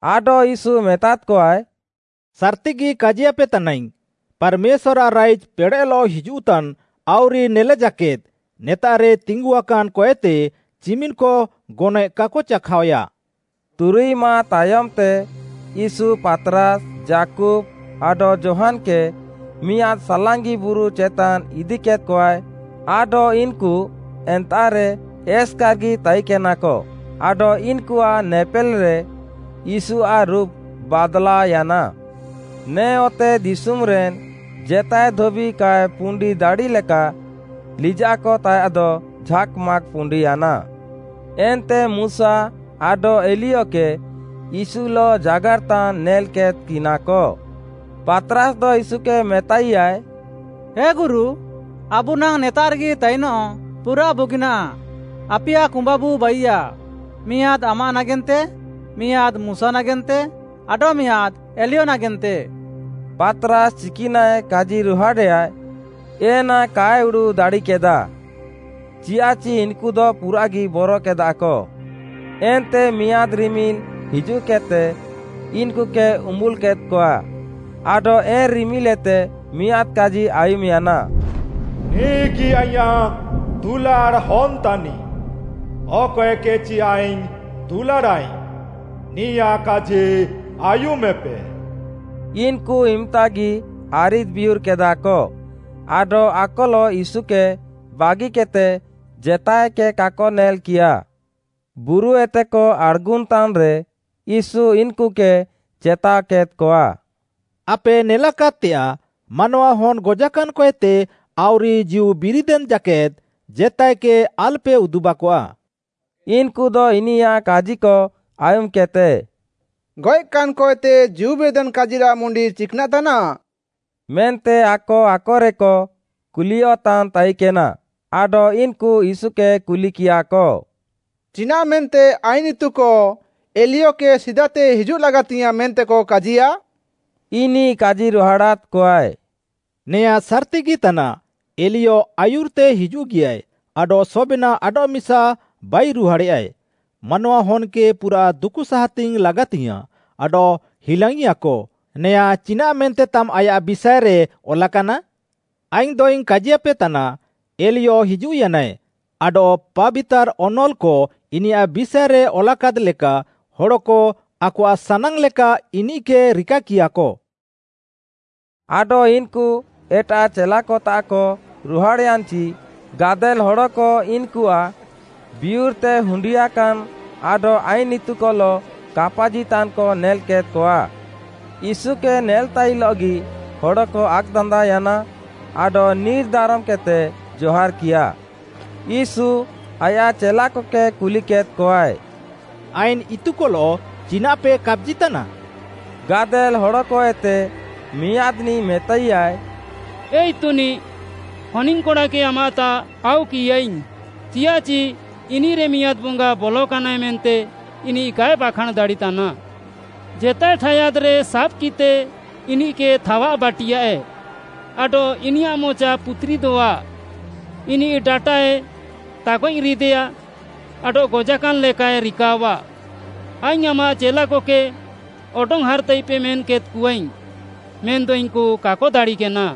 ଆଡଃ ୟୀଶୁ ମେତାଦ୍‌କଆଏ, “ସାର୍‌ତିଗି କାଜିୟାପେ ତାନାଇଙ୍ଗ୍‌, ପାର୍‌ମେଶ୍ୱାର୍‌ଆଃ ରାଇଜ୍‌ ପେଡ଼େଃଲଃ ହିଜୁଃତାନ୍‌ ଆଉରି ନେଲେ ଜାକେଦ୍, ନେତାଃରେ ତିଙ୍ଗୁଆକାନ୍‌ କଏତେ ଚିମିନ୍‌କ ଗନଏଃ କାକ ଚାଖାଅୟା।” ତୁରୁଇ ମାଃ ତାୟମ୍‌ତେ ୟୀଶୁ ପାତ୍‌ରାସ୍‌, ଯାକୁବ୍‌ ଆଡଃ ଯୋହାନ୍‌କେ ମିଆଁଦ୍‌ ସାଲାଙ୍ଗି ବୁରୁ ଚେତାନ୍ ଇଦିକେଦ୍‌କଆଏ ଆଡଃ ଇନ୍‌କୁ ଏନ୍ତାଃରେ ଏସ୍‌କାର୍‌ଗି ତାଇକେନାକ, ଆଡଃ ଇନ୍‌କୁଆଃ ନେପେଲ୍‌ରେ ୟୀଶୁଆଃ ରୁପ୍‌ ବାଦ୍‌ଲାଅୟାନା। ନେ ଅତେଦିଶୁମ୍‌ରେନ୍‌ ଜେତାଏ ଧୋବି କାଏ ପୁଣ୍ଡି ଦାଡ଼ିଲେକା, ଲିଜାଃକ ତାୟାଃଦ ଝାକ୍‌ ମାକ୍‌ ପୁଣ୍ଡିୟାନା। ଏନ୍ତେ ମୁଶା ଆଡଃ ଏଲିୟକେ, ୟୀଶୁଲଃ ଜାଗାର୍‌ତାନ୍‌ ନେଲ୍‌କେଦ୍‌କିନାକ। ପାତ୍‌ରାସ୍‌ଦ ୟୀଶୁକେ ମେତାଇୟାଏ, “ହେ ଗୁରୁ, ଆବୁ ନାଙ୍ଗ୍‌ ନେତାଃରେଗି ତାଇନଃ ପୁରାଃ ବୁଗିନାଃ, ଆପିୟା କୁମ୍ବାବୁ ବାଇୟାଃ, ମିଆଁଦ୍‌ ଆମାଃ ନାଗେନ୍ତେ, ମିଆଁଦ୍‌ ମୁଶା ନାଗେନ୍ତେ ଆଡଃ ମିଆଁଦ୍‌ ଏଲିୟ ନାଗେନ୍ତେ।” ପାତ୍‌ରାସ୍‌ ଚିକ୍‌ନାଃଏ କାଜିରୁହାଡ଼େୟା ଏନା କାଏ ଉଡ଼ୁଃ ଦାଡ଼ିକେଦା, ଚିୟାଃଚି ଇନ୍‌କୁଦ ପୁରାଃଗି ବରକେଦାକ। ଏନ୍ତେ ମିଆଁଦ୍‌ ରିମିଲ୍‌ ହିଜୁଃକେଦ୍‌ତେ ଇନ୍‌କୁକେ ଉମ୍ବୁଲ୍‌ କେଦ୍‌କଆଏ, ଆଡଃ ଏନ୍‌ ରିମିଲ୍ଏତେ ମିଆଁଦ୍‌ କାଜି ଆୟୁମ୍‌ୟାନା “ନିଃଗି ଆଇଁୟାଃ ଦୁଲାଡ଼୍‌ ହନ୍‌ତାନିଃ, ଅକଏକେଚି ଆଇଙ୍ଗ୍‌ ଦୁଲାଡ଼ାଃଇଙ୍ଗ୍‌, ନିୟାଃ କାଜି ଆୟୁମେପେ।” ଇନ୍‌କୁ ଇମ୍‌ତାଗି ଆରିଦ୍‌ ବିୟୁର୍‌କେଦାକ, ଆଡଃ ଆକଲଃ ୟୀଶୁକେ ବାଗିକେଦ୍‌ତେ ଜେତାଏକେ କାକ ନେଲ୍‌କିୟାଃ। ବୁରୁଏତେକ ଆଡ଼୍‌ଗୁନ୍‌ତାନ୍‌ରେ ୟୀଶୁ ଇନ୍‌କୁକେ ଚେତାଅକେଦ୍‌କଆ, “ଆପେ ନେଲାକାଦ୍‌ତେଆଃ, ମାନୱାହନ୍‌ ଗଜାକାନ୍‌କଏତେ ଆଉରି ଜୀଉବିରିଦେନ୍ ଜାକେଦ୍‌, ଜେତାଏକେ ଆଲ୍‌ପେ ଉଦୁବାକଆ।” ଇନ୍‌କୁଦ ଇନିୟାଃ କାଜିକ ଆୟୁମ୍‌କେଦ୍‌ତେ “ଗଏଃକାନ୍‌ କଏତେ ଜୀଉବିରିଦେନ୍ କାଜିରାଃ ମୁଣ୍ତି ଚିକ୍‌ନାଃ ତାନାଃ?” ମେନ୍ତେ ଆକ ଆକରେକ କୁଲିୟଃତାନ୍ ତାଇକେନା। ଆଡଃ ଇନ୍‌କୁ ୟୀଶୁକେ କୁଲିକିୟାଃକ, “ଚିନାଃ ମେନ୍ତେ ଆଇନ୍‌ ଇତୁକ ଏଲିୟକେ ସିଦାତେ ହିଜୁଃଲାଗାତିୟାଃଁ ମେନ୍ତେକ କାଜିୟାଃ?” ଇନିଃ କାଜିରୁହାଡ଼ାଦ୍‌କଆଏ, “ନେଆଁଁ ସାର୍‌ତିଗି ତାନାଃ, ଏଲିୟ ଆୟୁର୍‌ତେ ହିଜୁଃଗିୟାଏ, ଆଡଃ ସବେନାଃ ଆଡଃମିସା ବାଇରୁହାଡ଼େୟାଏ। ମାନୱାହନ୍‌କେ ପୁରାଃ ଦୁକୁସାହାତିଙ୍ଗ୍‌ ଲାଗାତିଙ୍ଗ୍‌ୟାଁଃ ଆଡଃ ହିଲାଙ୍ଗ୍‌ଇଆକ, ନେୟାଁ ଚିନାଃ ମେନ୍ତେତାମ୍‌ ଆୟାଃ ବିଷାଏରେ ଅଲାକାନା? ଆଇଙ୍ଗ୍‌ଦଇଙ୍ଗ୍‌ କାଜିପେତାନା, ଏଲିୟ ହିଜୁଃୟାନାଏ, ଆଡଃ ପାବିତାର୍‌ ଅନଲ୍‌କ ଇନିୟାଃ ବିଷାଏରେ ଅଲାକାଦ୍‌ ଲେକା, ହଡ଼କ ଆକଆଃ ସାନାଙ୍ଗ୍‌ ଲେକା ଇନିଃକେ ରିକାକିୟାଃକ।” ଆଡଃ ଇନ୍‌କୁ ଏଟାଃ ଚେଲାକତାଃକ ରୁହାଡ଼୍‌ୟାନ୍‌ଚି, ଗାଦେଲ୍‌ ହଡ଼କ ଇନ୍‌କୁଆଃ ବିୟୁର୍‌ତେ ହୁଣ୍ଡିଆକାନ୍‌ ଆଡଃ ଆଇନ୍‌ ଇତୁକଲଃ କାପାଜିତାନ୍‌କ ନେଲ୍‌କେଦ୍‌କଆ। ୟୀଶୁକେ ନେଲ୍‌ତାଇଲଃଗି ହଡ଼କ ଆକ୍‌ଦାନ୍ଦାଅୟାନା ଆଡଃ ନିର୍‌ ଦାରମ୍‌କେଦ୍‌ତେକ ଜହାର୍‌କିୟାଃ। ୟୀଶୁ, ଆୟାଃ ଚେଲାକକେ କୁଲିକେଦ୍‌କଆଏ, “ଆଇନ୍‌ ଇତୁକଲଃ ଚିନାଃପେ କାପାଜିତାନା?” ଗାଦେଲ୍‌ ହଡ଼କଏତେ ମିଆଁଦ୍‌ନିଃ ମେତାଇୟାଏ, “ଏ ଇତୁନିଃ, ହନିଙ୍ଗ୍‌କଡ଼ାକେ ଆମାଃତାଃ ଆଉକିୟାଇଙ୍ଗ୍‌, ଚିୟାଃଚି ଇନିଃରେ ମିଆଁଦ୍‌ ବଙ୍ଗା ବଲକାନାଏ ମେନ୍ତେ ଇନିଃ କାଏ ବାଖାଁଣ୍‌ ଦାଡ଼ିତାନା। ଜେତାଏ ଠାୟାଦ୍‌ରେ ସାବ୍‌କିଦ୍‌ତେ ଇନିଃକେ ଥାୱାଃବାଟିୟାଏ, ଆଡଃ ଇନିୟାଃ ମଚା ପୁତୁରିଦଃଆ, ଇନିଃ ଡାଟାଏ ତାଗଏଃରିଦେୟା ଆଡଃ ଗଜାକାନ୍‌ ଲେକାଏ ରିକାଅଃଆ। ଆଇଙ୍ଗ୍‌ ଆମାଃ ଚେଲାକକେ ଅଡଙ୍ଗ୍‌ହାର୍‌ତାଇପେ ମେନ୍‌କେଦ୍‌କଆଇଙ୍ଗ୍‌, ମେନ୍‌ଦ ଇନ୍‌କୁ କାକ ଦାଡ଼ିକେନା।”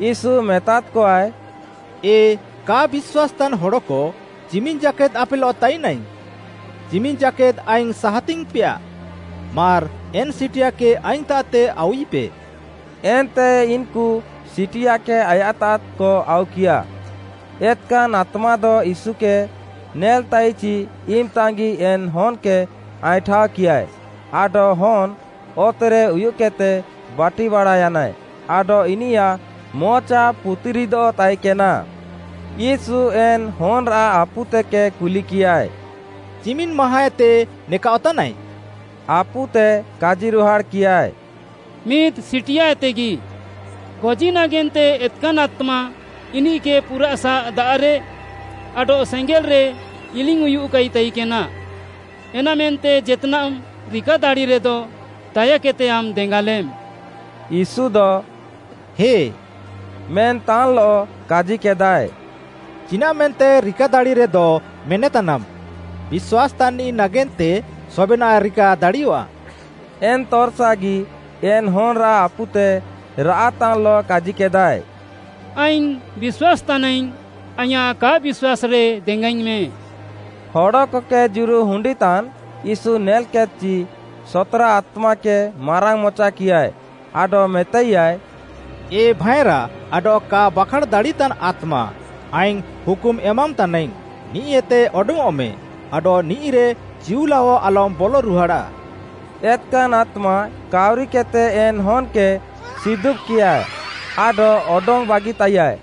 ୟୀଶୁ ମେତାଦ୍‌କଆଏ, “ଏ କା ବିଶ୍ୱାସ୍‌ତାନ୍‌ ହଡ଼କ, ଚିମିନ୍‌ ଜାକେଦ୍‌ ଆପେଲଃ ତାଇନାଇଙ୍ଗ୍‌? ଚିମିନ୍‌ ଜାକେଦ୍‌ ଆଇଙ୍ଗ୍‌ ସାହାତିଙ୍ଗ୍‌ପେଆ? ମାର୍‌ ଏନ୍‌ ସିଟିଆକେ ଆଇଙ୍ଗ୍‌ତାଃତେ ଆଉୱିପେ।” ଏନ୍ତେ ଇନ୍‌କୁ ସିଟିଆକେ ଆୟାଃତାଃକ ଆଉକିୟା। ଏତ୍‌କାନ୍‌ ଆତ୍ମାଦ ୟୀଶୁକେ ନେଲ୍‌ତାଇଚି ଇମ୍‌ତାଙ୍ଗ୍‌ଗି ଏନ୍‌ ହନ୍‌କେ ଆଇଁଠାଅକିୟାଏ ଆଡଃ ହନ୍‌ ଅତେରେ ଉୟୁଃକେଦ୍‌ତେ ବାଟିବାଡ଼ାୟାନାଏ ଆଡଃ ଇନିୟାଃ ମଚା ପୁତିରିଦଃ ତାଇକେନା। ୟୀଶୁ ଏନ୍‌ ହନ୍‌ରାଃ ଆପୁତେକେ କୁଲିକିୟାଏ, “ଚିମିନ୍‌ ମାହାଁଏତେ ନେକାଅଃତାନାଏ?” ଆପୁତେ କାଜିରୁହାଡ଼୍‌କିୟାଏ, “ମିଦ୍‌ ସିଟିଆଏତେଗି।” “ଗଜି ନାଗେନ୍ତେ ଏତ୍‌କାନ୍‌ ଆତ୍ମା ଇନିଃକେ ପୁରାଃସା ଦାଆଃରେ ଆଡଃ ସେଙ୍ଗେଲ୍‌ରେ ଇଲିଙ୍ଗ୍‌ଉୟୁଃକାଇ ତାଇକେନା। ଏନାମେନ୍ତେ ଜେତ୍‌ନାଃମ୍‌ ରିକାଦାଡ଼ିରେଦ ଦାୟାକେଦ୍‌ତେ ଆମ୍‌ ଦେଙ୍ଗାଲେମ୍।” ୟୀଶୁଦ “ହେ” ମେନ୍‌ତାନ୍‌ଲଃ, କାଜିକେଦାଏ, “ଚିନାଃମେନ୍ତେ ରିକାଦାଡ଼ିରେଦ ମେନେତାନାମ୍‌, ବିଶ୍ୱାସ୍‌ତାନ୍‌ନିଃ ନାଗେନ୍ତେ ସବେନାଃ ରିକାଦାଡ଼ିୟଆଃ।” ଏନ୍‌ ତର୍‌ସାଗି ଏନ୍‌ ହନ୍‌ରାଃ ଆପୁତେ ରାଆଃତାନ୍‌ଲଃ କାଜିକେଦାଏ, “ଆଇଙ୍ଗ୍‌ ବିଶ୍ୱାସ୍‌ ତାନାଇଙ୍ଗ୍‌, ଆଇଁୟାଃ କା ବିଶ୍ୱାସ୍‌ରେ ଦେଙ୍ଗାଇଙ୍ଗ୍‌ମେଁ।” ହଡ଼କକେ ଜୁରୁ ହୁଣ୍ଡିନ୍‌ତାନ୍ ୟୀଶୁ ନେଲ୍‌କେଦ୍‌କଚି, ସତ୍‌ରା ଆତ୍ମାକେ ମାରାଙ୍ଗ୍‌ମଚାକିୟାଏ ଆଡଃ ମେତାଇୟାଏ, “ଏ ଭାଏଁରା ଆଡଃ କା ବାଖାଁଣ୍‌ ଦାଡ଼ିତାନ୍‌ ଆତ୍ମା, ଆଇଙ୍ଗ୍‌ ହୁକୁମ୍ ଏମାମ୍‌ତାନାଇଙ୍ଗ୍‌, ନିଃଏତେ ଅଡଙ୍ଗ୍‌ଅଃମେ, ଆଡଃ ନିଃଇରେ ଚିଉଲାଅ ଆଲମ୍‌ ବଲ ରୁହାଡ଼ାଃ।” ଏତ୍‌କାନ୍‌ ଆତ୍ମା କାଉରିକେଦ୍‌ତେ ଏନ୍‌ ହନ୍‌କେ ସିଦୁବ୍‌କିୟା ଆଡଃ ଅଡଙ୍ଗ୍‌ ବାଗିତାଇୟାଏ।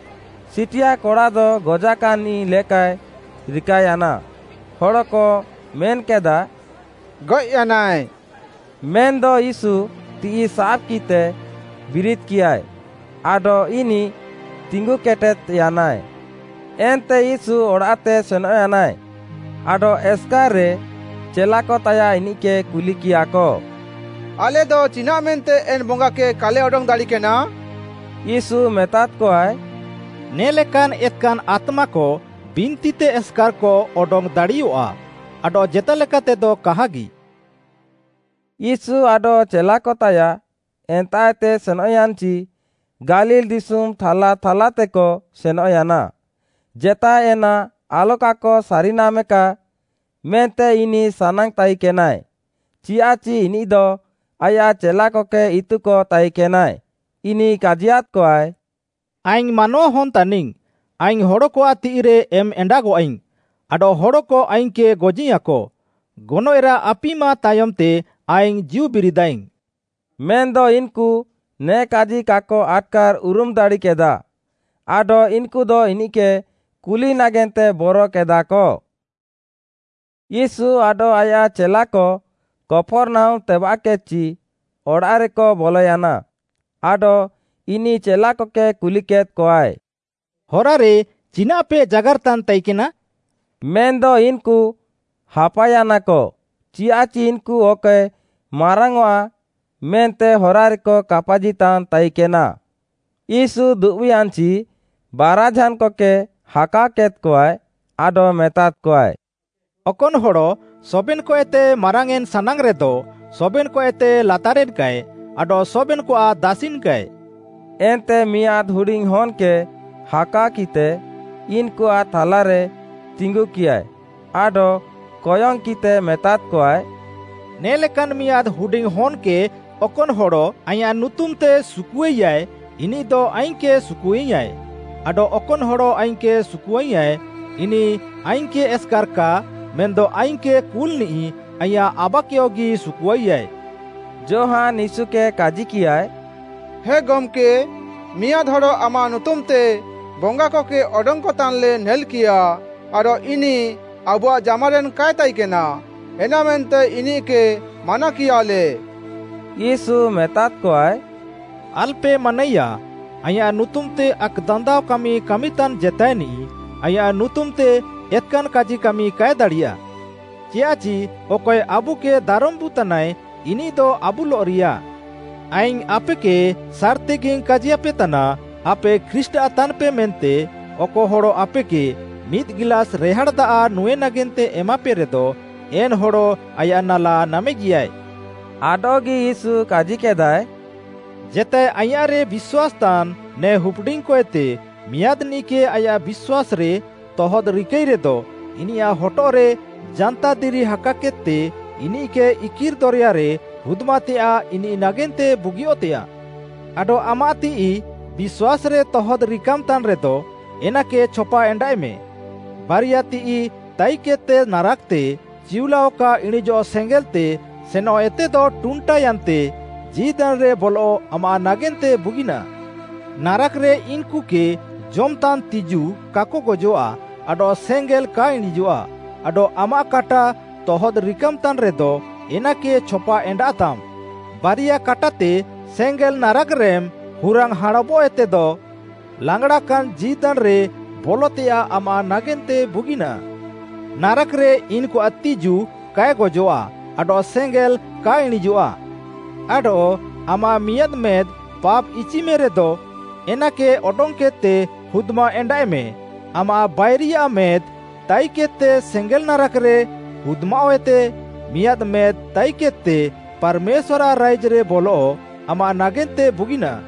ସିଟିଆ କଡ଼ାଦ ଗଜାକାନ୍‌ନିଃ ଲେକାଏ ରିକାୟାନା; ହଡ଼କ ମେନ୍‌କେଦାଃ, “ଗଏଃୟାନାଏ।” ମେନ୍‌ଦ ୟୀଶୁ ତିଃଇ ସାବ୍‌କିତେ ବିରିଦ୍‌କିୟାଏ, ଆଡଃ ଇନିଃ ତିଙ୍ଗୁକେଟେଦ୍‌ୟାନାଏ। ଏନ୍ତେ ୟୀଶୁ ଅଡ଼ାଃତେ ସେନଃୟାନାଏ, ଆଡଃ ଏସ୍‌କାର୍‌ରେ ଚେଲାକତାୟାଃ ଇନିଃକେ କୁଲିକିୟାଃକ, “ଆଲେଦ ଚିନାଃମେନ୍ତେ ଏନ୍‌ ବଙ୍ଗାକେ କାଲେ ଅଡଙ୍ଗ୍‌ ଦାଡ଼ିକେନା?” ୟୀଶୁ ମେତାଦ୍‌କଆଏ “ନେ ଲେକାନ୍ ଏତ୍‌କାନ୍‌ ଆତ୍ମାକ ବିନ୍ତିତେ ଏସ୍‌କାର୍‌କ ଅଡଙ୍ଗ୍‌ ଦାଡ଼ିୟଃଆ, ଆଡଃ ଜେତାଲେକାତେଦ କାହାଗି।” ୟୀଶୁ ଆଡଃ ଚେଲାକତାୟାଃ ଏନ୍ତାଃଏତେ ସେନଃୟାନ୍‌ଚି ଗାଲିଲ୍‌ ଦିଶୁମ୍‌ ଥାଲା ଥାଲାତେକ ସେନଃୟାନା। ଜେତାଏ ଏନା ଆଲକାକ ସାରିନାମେକା ମେନ୍ତେ ଇନିଃ ସାନାଙ୍ଗ୍‌ତାଇକେନାଏ, ଚିୟାଃଚି ଇନିଃଦ ଆୟାଃ ଚେଲାକକେ ଇତୁକ ତାଇକେନାଏ। ଇନିଃ କାଜିୟାଦ୍‌କଆଏ, “ଆଇଙ୍ଗ୍‌ ମାନୱାହନ୍‌ ତାନିଙ୍ଗ୍‌, ଆଇଙ୍ଗ୍‌ ହଡ଼କଆଃ ତିଃଇରେ ଏମ୍‌ଏଣ୍ଡାଗଃଆଇଙ୍ଗ୍‌, ଆଡଃ ହଡ଼କ ଆଇଙ୍ଗ୍‌କେ ଗଜିୟାଁକ, ଗନଏଃରାଃ ଆପିମା ତାୟମ୍‌ତେ ଆଇଙ୍ଗ୍‌ ଜୀଉ ବିରିଦାଃଇଙ୍ଗ୍‌।” ମେନ୍‌ଦ ଇନ୍‌କୁ ନେ କାଜି କାକ ଆଟ୍‌କାର୍‌ ଉରୁମ୍‌ ଦାଡ଼ିକେଦା, ଆଡଃ ଇନ୍‌କୁଦ ଇନିଃକେ କୁଲି ନାଗେନ୍ତେ ବରକେଦାଃକ। ୟୀଶୁ ଆଡଃ ଆୟାଃ ଚେଲାକ କପର୍‌ନାହୁମ୍‌ ତେବାଃକେଦ୍‌ଚି ଅଡ଼ାଃରେକ ବଲୟାନା, ଆଡଃ ଇନିଃ ଚେଲାକକେ କୁଲିକେଦ୍‌କଆଏ, “ହରାରେ ଚିନାଃପେ ଜାଗାର୍‌ତାନ୍‌ ତାଇକେନା?” ମେନ୍‌ଦ ଇନ୍‌କୁ ହାପାୟାନାକ, ଚିୟାଃଚି ଇନ୍‌କୁ ଅକଏ ମାରାଙ୍ଗ୍‌ଆଁ ମେନ୍ତେ ହରାରେକ କାପାଜିତାନ୍ ତାଇକେନା। ୟୀଶୁ ଦୁବ୍‌ୟାନ୍‌ଚି ବାରାଝାନ୍‌କକେ ହାକାଅକେଦ୍‌କଆଏ ଆଡଃ ମେତାଦ୍‌କଆଏ, “ଅକନ୍‌ ହଡ଼ ସବେନ୍‌କଏତେ ମାରାଙ୍ଗ୍‌ୟେଁନ୍‌ ସାନାଙ୍ଗ୍‌ରେଦ, ସବେନ୍‌କଏତେ ଲାତାରେନ୍‌କାଏ ଆଡଃ ସବେନ୍‌କଆଃ ଦାସିନ୍ କାଏ।” ଏନ୍ତେ ମିଆଁଦ୍‌ ହୁଡିଙ୍ଗ୍‌ ହନ୍‌କେ ହାକାଅକିଃତେ ଇନ୍‌କୁଆଃ ଥାଲାରେ ତିଙ୍ଗୁକିୟାଏ ଆଡଃ କୟଙ୍ଗ୍‌କିଃତେ ମେତାଦ୍‌କଆଏ, ନେ ଲେକାନ୍ ମିଆଁଦ୍‌ ହୁଡିଙ୍ଗ୍‌ ହନ୍‌କେ ଅକନ୍‌ ହଡ଼ “ଆଇଁୟାଃ ନୁତୁମ୍‌ତେ ସୁକୁଆଇୟାଏ ଇନିଃଦ ଆଇଙ୍ଗ୍‌କେ ସୁକୁଆୟାଁଏ, ଆଡଃ ଅକନ୍‌ ହଡ଼ ଆଇଙ୍ଗ୍‌କେ ସୁକୁଆୟାଁଏ, ଇନିଃ ଆଇଙ୍ଗ୍‌କେ ଏସ୍‌କାର୍‌ କା ମେନ୍‌ଦ ଆଇଙ୍ଗ୍‌କେ କୁଲ୍‌ନିଃ ଆଇଁୟାଃ ଆବାକେୟଗି ସୁକୁଆଇୟାଏ।” ଯୋହାନ୍‌ ୟୀଶୁକେ କାଜିକିୟାଏ, “ହେ ଗମ୍‌କେ, ମିଆଁଦ୍‌ ହଡ଼ ଆମାଃ ନୁତୁମ୍‌ତେ ବଙ୍ଗାକକେ ଅଡଙ୍ଗ୍‌କତାନ୍‌ଲେ ନେଲ୍‌କିୟା ଆଡଃ ଇନିଃ ଆବୁଆଃ ଜାମାରେନ୍ କାଏ ତାଇକେନା, ଏନାମେନ୍ତେ ଇନିଃକେ ମାନାକିୟାଲେ।” “ୟୀଶୁ ମେତାଦ୍‌କଆଏ, ଆଲ୍‌ପେ ମାନାଇୟା, ଆଇଁୟାଃ ନୁତୁମ୍‌ତେ ଆକ୍‌ଦାନ୍ଦାଅ କାମି କାମିତାନ୍‌ ଜେତାଏନିଃ ଆଇଁୟାଃ ନୁତୁମ୍‌ତେ ଏତ୍‌କାନ୍‌ କାଜି କାମି କାଏ ଦାଡ଼ିୟା। ଚିୟାଃଚି ଅକଏ ଆବୁକେ ଦାରମ୍‌ବୁତାନାଏ, ଇନିଃଦ ଆବୁଲଃରିୟା। ଆଇଙ୍ଗ୍‌ ଆପେକେ ସାର୍‌ତିଗିଇଙ୍ଗ୍‌ କାଜିୟାପେତାନା, ଆପେ ଖ୍ରୀଷ୍ଟ୍‌ଆଃ ତାନ୍‌ପେ ମେନ୍ତେ ଅକ ହଡ଼ ଆପେକେ ମିଦ୍‌ ଗିଲାସ୍‌ ରେହାଡ଼୍‌ ଦାଆଃ ନୁଁଏ ନାଗେନ୍ତେ ଏମାପେରେଦ, ଏନ୍‌ ହଡ଼ ଆୟାଃ ନାଲା ନାମେଗିୟାଏ। “ଆଡଃଗି ୟୀଶୁ କାଜିକେଦାଃଏ, ଜେତାଏ ଆଇଁୟାଃରେ ବିଶ୍ୱାସ୍‌ତାନ୍‌ ନେ ହୁପ୍‌ଡିଙ୍ଗ୍‌କଏତେ ମିଆଁଦ୍‌ନିଃକେ ଆୟାଃ ବିଶ୍ୱାସ୍‌ରେ ତହଦ୍‍ରିକାଇରେଦ ଇନିୟାଃ ହଟଃରେ ଜାନ୍ତାଦିରି ହାକାକେଦ୍‌ତେ ଇନିଃକେ ଇକିର୍‌ ଦରେୟାରେ ହୁଦ୍‌ମାତେୟାଃ ଇନିଃ ନାଗେନ୍ତେ ବୁଗିଅଃତେଆଃ। ଆଡଃ ଆମାଃ ତିଃଇ ବିଶ୍ୱାସ୍‌ରେ ତହଦ୍‍ ରିକାମ୍‌ତାନ୍‌ରେଦ, ଏନାକେ ଛପାଏଣ୍ଡାଃଏମେ। ବାରିଆଃ ତିଃଇ ତାଇକେଦ୍‌ତେ ନାରାକ୍‌ତେ, ଚିଉଲାଅ କା ଇଣିଁଜଃ ସେଙ୍ଗେଲ୍‌ତେ ସେନଃଏତେଦ ଟୁଣ୍ଟାୟାନ୍ତେ ଜୀଦାନ୍‌ରେ ବଲଃ ଆମାଃ ନାଗେନ୍ତେ ବୁଗିନାଃ। ନାରାକ୍‌ରେ ଇନ୍‌କୁକେ ଜମ୍‌ତାନ୍ ତିଜୁ କାକ ଗଜଃଆ ଆଡଃ ସେଙ୍ଗେଲ୍ କା ଇଣିଁଜଃଆ ଆଡଃ ଆମାଃ କାଟା ତହଦ୍‍ ରିକାମ୍‌ତାନ୍‌ ରେଦ, ଏନାକେ ଛପା ଏଣ୍ଡାଃତାମ୍। ବାରିଆ କାଟାତେ, ସେଙ୍ଗେଲ୍ ନାରାକ୍‌ରେମ୍‌ ହୁରାଙ୍ଗ୍‌ ହାଁଣବଃଏତେଦ, ଲାଙ୍ଗ୍‌ଡ଼ାକାନ୍ ଜୀଦାନ୍‌ରେ ବଲଃତେୟାଃ ଆମ୍‌ ନାଗେନ୍ତେ ବୁଗିନାଃ। ନାରାକ୍‌ରେ ଇନ୍‌କୁଆଃ ତିଜୁ କାଏ ଗଜଃଆ ଆଡଃ ସେଙ୍ଗେଲ୍ କା ଇଣିଁଜଃଆ। ଆଡଃ ଆମାଃ ମିଆଁଦ୍‌ ମେଦ୍‌ ପାପ୍‌ଇଚିମେରେଦ, ଏନାକେ ଅଡଙ୍ଗ୍‌କେଦ୍‌ତେ ହୁଦ୍‌ମାଏଣ୍ଡାଃଏମେ। ଆମାଃ ବାରିଆ ମେଦ୍‌ ତାଇକେଦ୍‌ତେ ସେଙ୍ଗେଲ୍ ନାରାକ୍‌ରେ ହୁଦ୍‌ମାଅଃଏତେ ମିଆଁଦ୍‌ ମେଦ୍‌ ତାଇକେଦ୍‌ତେ ପାର୍‌ମେଶ୍ୱାର୍‌ଆଃ ରାଇଜ୍‌ରେ ବଲଃ ଆମାଃ ନାଗେନ୍ତେ ବୁଗିନାଃ।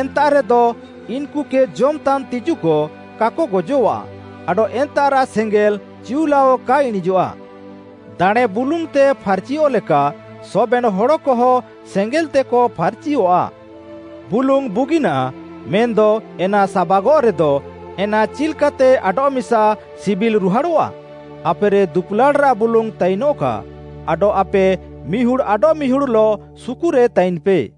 ଏନ୍ତାଃରେଦ ଇନ୍‌କୁକେ ଜମ୍‌ତାନ୍ ତିଜୁକ କାକ ଗଜଃଆ ଆଡଃ ଏନ୍ତାଃରାଃ ସେଙ୍ଗେଲ୍ ଚିଉଲାଅ କା ଇଣିଁଜଃଆ। “ଦାଣେଁ ବୁଲୁଙ୍ଗ୍‌ତେ ଫାର୍‌ଚିଅଃ ଲେକା ସବେନ୍‌ ହଡ଼କହ ସେଙ୍ଗେଲ୍‌ତେକ ଫାର୍‌ଚିଅଃଆ। “ବୁଲୁଙ୍ଗ୍‌ ବୁଗିନାଃ, ମେନ୍‌ଦ ଏନା ସାବାଗଃରେଦ, ଏନା ଚିଲ୍‌କାତେ ଆଡଃମିସା ସିବିଲ୍‌ରୁହାଡ଼ଃଆ? ଆପେରେ ଦୁପୁଲାଡ଼୍‌ରାଃ ବୁଲୁଙ୍ଗ୍‌ ତାଇନଃକା, ଆଡଃ ଆପେ ମିହୁଡ଼୍‌ ଆଡଃମିହୁଡ଼୍‌ଲଃ ସୁକୁରେ ତାଇନ୍‌ପେ।”